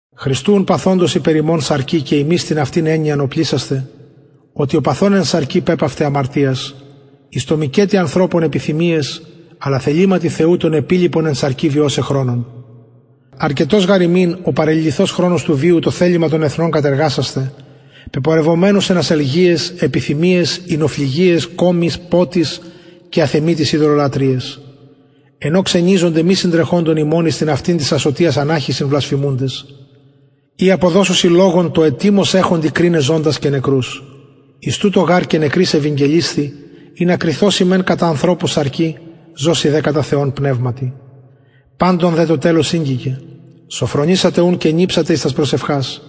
χριστου ουν παθοντος υπερ ημων σαρκι και υμεις την αυτην εννοιαν οπλισασθε οτι ο παθων εν σαρκι πεπαυται αμαρτιας εις το μηκετι ανθρωπων επιθυμιαις αλλα θεληματι θεου τον επιλοιπον εν σαρκι βιωσαι χρονον αρκετος γαρ ημιν ο παρεληλυθως χρονος του βιου το θελημα των εθνων κατεργασασθαι πεπορευμενους εν ασελγειαις επιθυμιαις οινοφλυγιαις κωμοις ποτοις και αθεμιτοις ειδωλολατρειαις εν ω ξενιζονται μη συντρεχοντων υμων εις την αυτην της ασωτιας αναχυσιν βλασφημουντες οι αποδωσουσιν λογον τω ετοιμως εχοντι κριναι ζωντας και νεκρους εις τουτο γαρ και νεκροις ευηγγελισθη ινα κριθωσιν μεν κατα ανθρωπους σαρκι ζωσιν δε κατα θεον πνευματι παντων δε το τελος ηγγικεν σωφρονησατε ουν και νηψατε εις τας προσευχας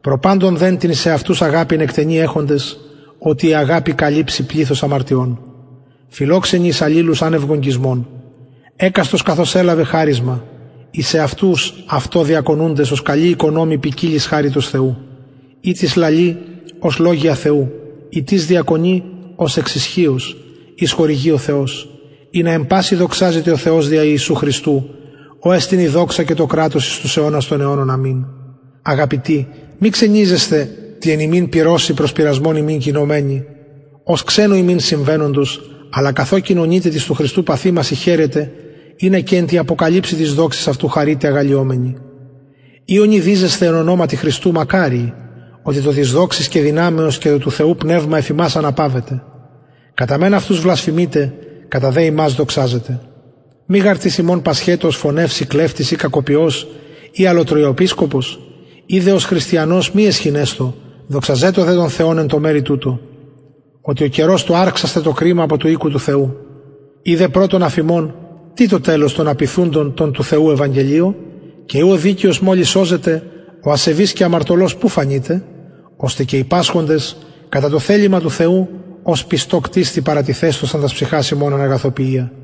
προ παντων δε την εις εαυτους αγαπην εκτενη εχοντες οτι αγαπη καλυψει πληθος αμαρτιων φιλοξενοι εις αλληλους ανευ γογγυσμων εκαστος καθως ελαβεν χαρισμα εις εαυτους αυτο διακονουντες ως καλοι οικονομοι ποικιλης χαριτος θεου ει τις λαλει ως λογια θεου ει τις διακονει ως εξ ισχυος ως χορηγει ο θεος ινα εν πασιν δοξαζηται ο θεος δια ιησου χριστου ω εστιν η δοξα και το κρατος εις τους αιωνας των αιωνων αμην αγαπητοι μη ξενιζεσθε τη εν υμιν πυρωσει προς πειρασμον υμιν γινομενη ως ξενου υμιν συμβαινοντος αλλα καθο κοινωνειτε τοις του χριστου παθημασιν χαιρετε ινα και εν τη αποκαλυψει της δοξης αυτου χαρητε αγαλλιωμενοι ει ονειδιζεσθε εν ονοματι χριστου μακαριοι οτι το της δοξης και το του θεου πνευμα εφ υμας αναπαυεται κατα μεν αυτους βλασφημειται κατα δε υμας δοξαζεται μη γαρ τις υμων πασχετω ως φονευς η κλεπτης η κακοποιος η ως αλλοτριοεπισκοπος ει δε ως χριστιανος μη αισχυνεσθω δοξαζετω δε τον θεον εν τω μερει τουτω οτι ο καιρος του αρξασθαι το κριμα απο του οικου του θεου ει δε πρωτον αφ ημων τι το τελος των απειθουντων τω του θεου ευαγγελιω και ει ο δικαιος μολις σωζεται ο ασεβης και αμαρτωλος που φανειται ωστε και οι πασχοντες κατα το θελημα του θεου ως πιστω κτιστη παρατιθεσθωσαν τας ψυχας αυτων εν αγαθοποιια